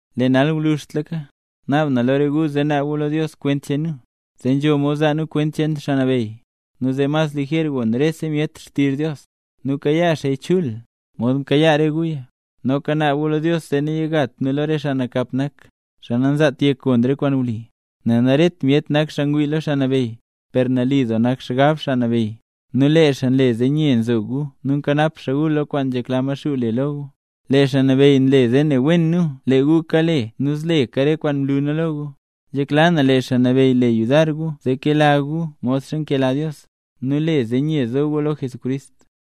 Lee nal gwluzhtlaka, naab na lo re gu zee naab gu lo Dios kwent cheen nu, zee nzho mod zaa nu kwent cheen Xaa Nabeyy, nu zee mas lijer gon rese myet xtizh Dios, nu kayaa xaaya chul, mod mkayaa re guya. Noka naab gu lo Dios zee nayigat nu lo re xaa nakap nak, xaa nanzaat yek gon re kwaan wli, nel naret myet nak xaa ngwii lo Xaa Nabeyy. Per nali doo nak xgab Xaa Nabeyy, nu lee xaa nle zee nye nzo gu nu nkanap xaa gu lo kwaan nzhekla Maxuu le lo gu. Lee Xaa Nabeyy nle zee ne wen nu lee gu kale nu zleka re kwaan mlu nu lo gu. Nzhekla na lee Xaa Nabeyy le yudar gu zee kela gu modxa nkela Dios, nu le zee nye zo gu lo Jesucrist.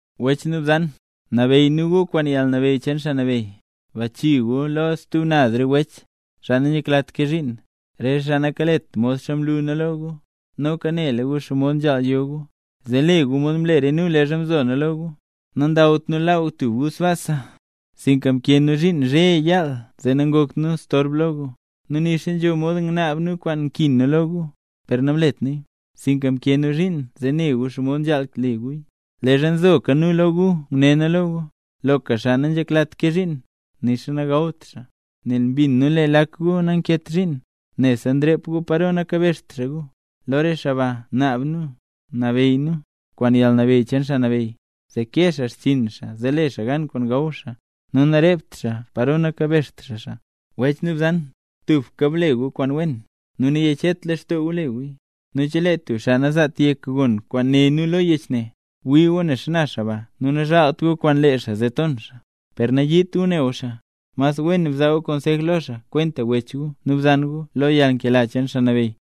Wech nu bzan, nabeyy nu gu kwaan yalnabeyy cheen Xaa Nabeyy, bachii gu lo stub naz re wech, xaa nanzheklat kee zhiin, re xaa nakalet modxa mlu nu lo gu. Noka nela gu xomod nzhaal yo gu, zee le gu mod mle re nu leezha mzo nu lo gu. Nandawt nu laaw tub gu sbaasa, sinka mkee nu zhiin zhe nu yaal zee nangakt nu storb lo gu. Nu nixa nzho mod ngnaab nu kwaan nkin nu lo gu, per namlet nuya, sinka mkee nu zhiin zee ne gu xomod nzhaal le guya. Leezha nzoka nu lo gu nguné nu lo gu, loka xaa nanzheklat kee zhiin, nixa nagawt xaa. Nel mbin nu lee lak gu nankeet zhiin, nebse nrep gu paro nakabezht xaa gu. Lo re xaa ba, naab nu, nu nabeyy nu, kwaan yalnabeyy cheen Xaa Nabeyy, zee kee xaa xchiin xaa zee le xaa gan kwaan gaw xaa, nu narept xaa paro nakabezht xaa xaa. Wech nu bzan, tubka ble gu re kwaan wen, nu nayechet lextoo gu le guya. Nu chelee tub xaa nanzaat yek gon kwaan né nu lo yech ne, bwii gu ne xana xaa ba nu nazhaalt gu kwaan lee xaa, zee ton xaa. Per nayiit gu ne gu xaa, mas wen bzaa gu konsej lo xaa kwenta wech gu nu bzan gu lo yalnkela cheen Xaa Nabeyy.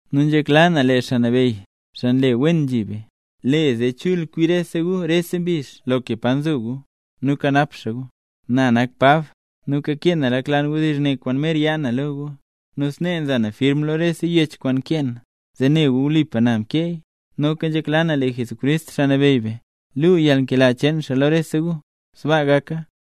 Nu nzhekla na lee Xaa Nabeyy, xaa nle wen nzhi be, le zee chul kwi gu rese mbizh loka pa nzo gu, nu kanap xaa gu. Na nak Pab, nu kakee na lak lan wdizh ne kwaan mer yaa na lo gu. Nu snee nza na firm lo rese yech kwaan nkee na, zee ne gu wlipa na mkeeya. Noka nzhekla na lee Jesucrist Xaa Nabeyy be, luu yalnkela cheen xaa lo rese gu. Sbaa gaka.